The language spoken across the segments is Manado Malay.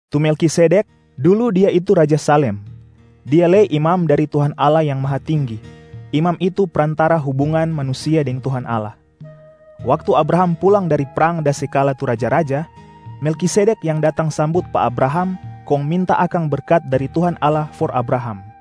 Tu Melkisedek, dulu dia itu raja Salem, dia lei imam dari Tuhan Allah Yang Mahatinggi, imam itu prantara hubungan manusia deng Tuhan Allah. Waktu Abraham pulang dari prang da se kala tu raja-raja, Melkisedek yang datang sambut pa Abraham kong minta akang berkat dari Tuhan Allah for Abraham.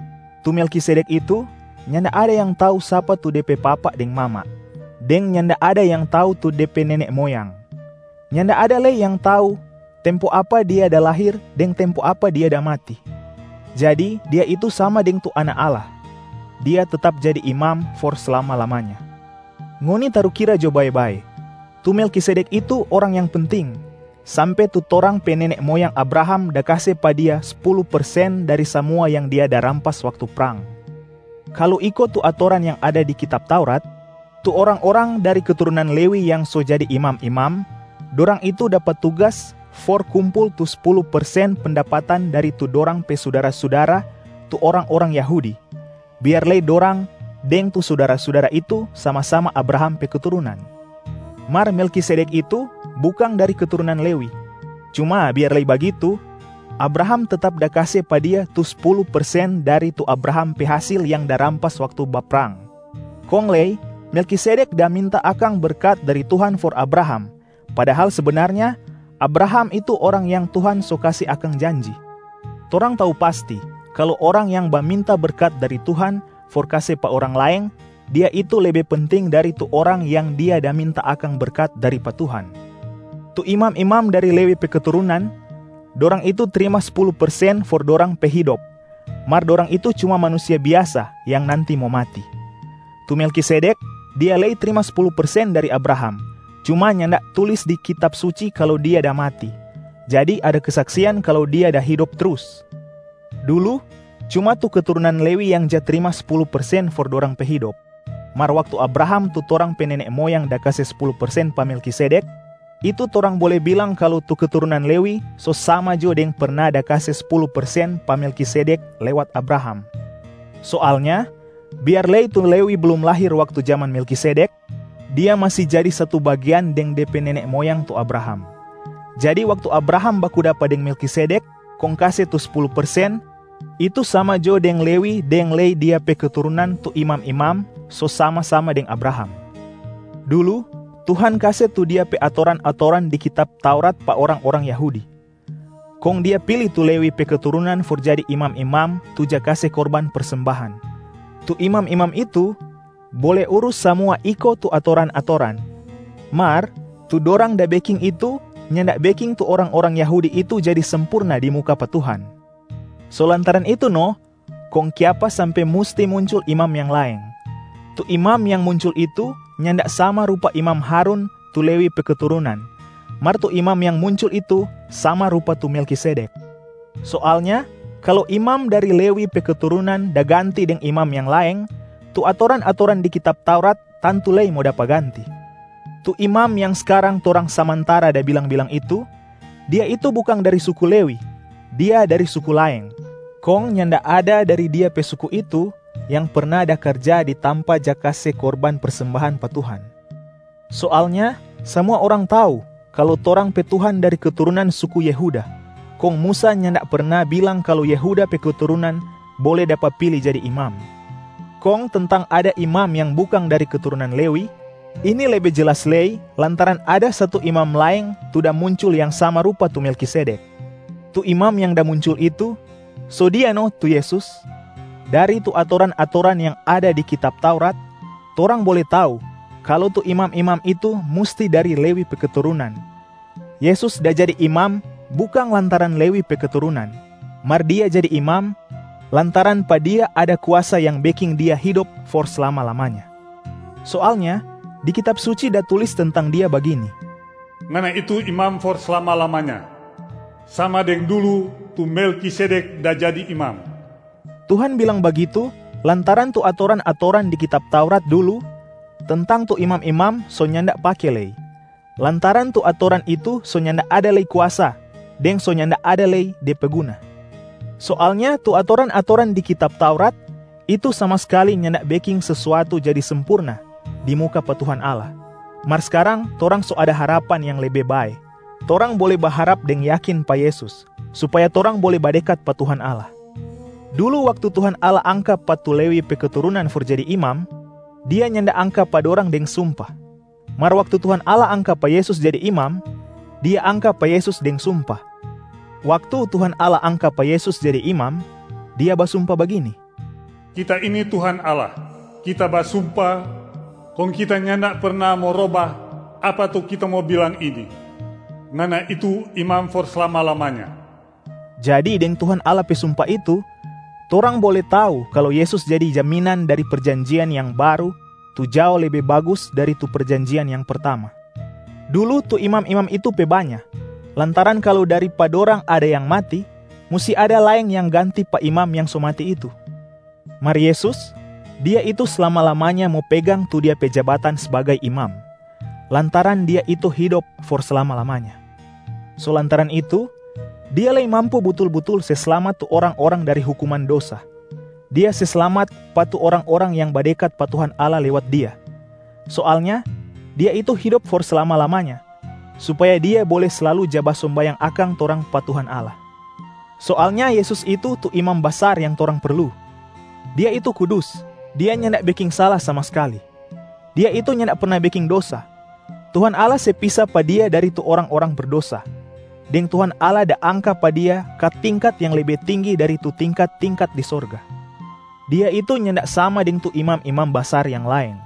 Tu Melkisedek itu, nyanda ada yang tau sapa tu de pe papa deng mama, deng nyanda ada yang tau tu de pe nene moyang. Nyanda ada lei yang tau tempo apa dia da lahir deng tempo apa dia da mati. Jadi dia itu sama deng tu Anak Allah, dia tetap jadi imam for slama-lamanya. Ngoni tarukira jo bae-bae, tu Melkisedek itu orang yang penting, sampe tu torang pe nene moyang Abraham da kase pa dia spulu persen dari samua yang dia da rampas waktu prang. Kalu iko tu atoran yang ada di kitab Taurat, tu orang-orang dari keturunan Lewi yang so jadi imam-imam, dorang itu dapa tugas for kumpul tu spulu persen pendapatan dari tu dorang pe sudara-sudara tu orang-orang Yahudi, biar lei dorang deng tu sudara-sudara itu sama-sama Abraham pe keturunan. Mar Melkisedek itu bukang dari keturunan Lewi, cuma biar lei bagitu Abraham tetap da kase pa dia tu spulu persen dari tu Abraham pe hasil yang da rampas waktu baprang. Kong lei Melkisedek da minta akang berkat dari Tuhan for Abraham, padahal sebenarnya Abraham itu orang yang Tuhan so kase akang janji. Torang tau pasti kalu orang yang baminta berkat dari Tuhan for kase pa orang laeng, dia itu lebe penting dari tu orang yang dia da minta akang berkat dari pa Tuhan. Tu imam-imam dari Lewi pe keturunan, dorang itu trima spulu persen for dorang pe hidop, mar dorang itu cuma manusia biasa yang nanti mo mati. Tu Melkisedek, dia lei trima spulu persen dari Abraham, cuma nyanda tulis di Kitab Suci kalu dia da mati, jadi ada kesaksian kalu dia da hidop trus. Dulu cuma tu keturunan Lewi yang ja trima spulu persen for dorang pe hidop. Mar waktu Abraham tu torang pe nene moyang da kase spulu persen pa Melkisedek, itu torang bole bilang kalu tu keturunan Lewi so sama jo deng perna da kase spulu persen pa Melkisedek lewat Abraham. Soalnya biar lei tu Lewi blum lahir waktu jaman Melkisedek, dia masi jadi satu bagean deng de pe nene moyang tu Abraham. Jadi waktu Abraham baku dapa deng Melkisedek kong kase tu spulu persen, itu sama jo deng Lewi deng lei dia pe keturunan tu imam-imam so sama-sama deng Abraham. Dulu Tuhan kase tu Dia pe atoran-atoran di kitab Taurat pa orang-orang Yahudi, kong Dia pili tu Lewi pe keturunan for jadi imam-imam tu ja kase korban persembahan. Tu imam-imam itu bole urus samua iko tu atoran-atoran, mar tu dorang da beking itu nyanda beking tu orang-orang Yahudi itu jadi sempurna di muka pa Tuhan. So lantaran itu no kong kiapa sampe musti muncul imam yang laeng. Tu imam yang muncul itu nyanda sama rupa imam Harun tu Lewi pe keturunan, mar tu imam yang muncul itu sama rupa tu Melkisedek. Soalnya kalu imam dari Lewi pe keturunan da ganti deng imam yang laeng, tu atoran-atoran di kitab Taurat tantu lei mo dapa ganti. Tu Imam yang skarang torang samantara da bilang-bilang itu, Dia itu bukang dari suku Lewi, Dia dari suku laeng, kong nyanda ada dari Dia pe suku itu yang perna da karja di tampa ja kase korban persembahan pa Tuhan. Soalnya samua orang tau kalu torang pe Tuhan dari keturunan suku Yehuda, kong Musa nyanda perna bilang kalu Yehuda pe keturunan bole dapa pili jadi imam. Kong tentang ada imam yang bukang dari keturunan Lewi, ini lebe jelas lei lantaran ada satu Imam laeng tu da muncul yang sama rupa tu Melkisedek. Tu Imam yang da muncul itu, so Dia no tu Yesus. Dari tu atoran-atoran yang ada di kitab Taurat, torang bole tau kalu tu imam-imam itu musti dari Lewi pe keturunan. Yesus da jadi Imam bukang lantaran Lewi pe keturunan, mar Dia jadi Imam lantaran pa Dia ada kuasa yang beking Dia hidop for slama-lamanya. Soalnya di Kitab Suci da tulis tentang Dia bagini, “Ngana itu Imam for slama-lamanya, sama deng dulu tu Melkisedek da jadi imam.” Tuhan bilang bagitu lantaran tu atoran-atoran di kitab Taurat dulu tentang tu imam-imam so nyanda pake lei, lantaran tu atoran itu so nyanda ada lei kuasa deng so nyanda ada lei de pe guna. Soalnya tu atoran-atoran di kitab Taurat, itu sama skali nyanda beking sesuatu jadi sempurna di muka pa Tuhan Allah. Mar skarang torang so ada harapan yang lebe bae, torang bole baharap deng yakin pa Yesus supaya torang bole badekat pa Tuhan Allah. Dulu waktu Tuhan Allah angka pa tu Lewi pe keturunan for jadi imam, Dia nyanda angka pa dorang deng sumpa. Mar waktu Tuhan Allah angka pa Yesus jadi Imam, Dia angka pa Yesus deng sumpa. Waktu Tuhan Allah angka pa Yesus jadi Imam, Dia basumpa bagini, “Kita ini Tuhan Allah! Kita basumpa kong Kita nyanda perna mo roba apa tu Kita mo bilang ini, ‘Ngana itu Imam for slama-lamanya.’” Jadi deng Tuhan Allah pe sumpa itu, torang bole tau kalu Yesus jadi jaminan dari perjanjian yang baru tu jao lebe bagus dari tu perjanjian yang pertama. Dulu tu imam-imam itu pe banya lantaran kalu dari pa dorang ada yang mati, musti ada laeng yang ganti pa imam yang so mati itu. Mar Yesus, Dia itu slama-lamanya mo pegang tu Dia pe jabatan sbagai Imam, lantaran Dia itu hidop for slama-lamanya. So lantaran itu, Dia lei mampu butul-butul se slamat tu orang-orang dari hukuman dosa. Dia se slamat pa tu orang-orang yang badekat pa Tuhan Allah lewat Dia. Soalnya, Dia itu hidop for slama-lamanya supaya Dia bole slalu ja basombayang akang torang pa Tuhan Allah. Soalnya Yesus itu, tu Imam Basar yang torang perlu. Dia itu kudus, Dia nyanda beking sala sama skali, Dia itu nyanda perna beking dosa. Tuhan Allah se pisa pa Dia dari tu orang-orang berdosa, deng Tuhan Allah da angka pa Dia ka tingkat yang lebe tinggi dari tu tingkat-tingkat di sorga. Dia itu nyanda sama deng tu imam-imam basar yang laeng.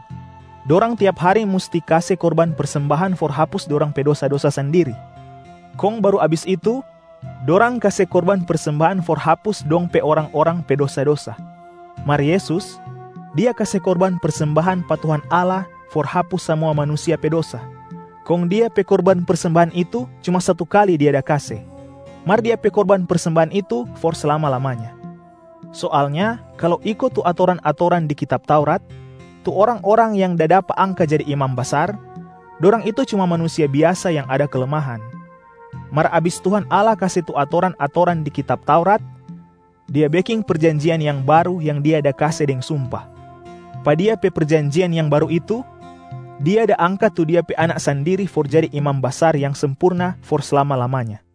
Dorang tiap hari musti kase korban persembahan for hapus dorang pe dosa-dosa sandiri, kong baru abis itu dorang kase korban persembahan for hapus dong pe orang-orang pe dosa-dosa. Mar Yesus, Dia kase korban persembahan pa Tuhan Allah for hapus samua manusia pe dosa, kong Dia pe korban persembahan itu cuma satu kali Dia da kase, mar Dia pe korban persembahan itu for slama-lamanya. Soalnya kalu iko tu atoran-atoran di kitab Taurat, tu orang-orang yang da dapa angka jadi imam basar, dorang itu cuma manusia biasa yang ada kelemahan. Mar abis Tuhan Allah kase tu atoran-atoran di kitab Taurat, Dia beking perjanjian yang baru yang Dia da kase deng sumpa. Pa Dia pe perjanjian yang baru itu, Dia da angka tu Dia pe Anak sandiri for jadi Imam Basar yang sempurna for slama-lamanya.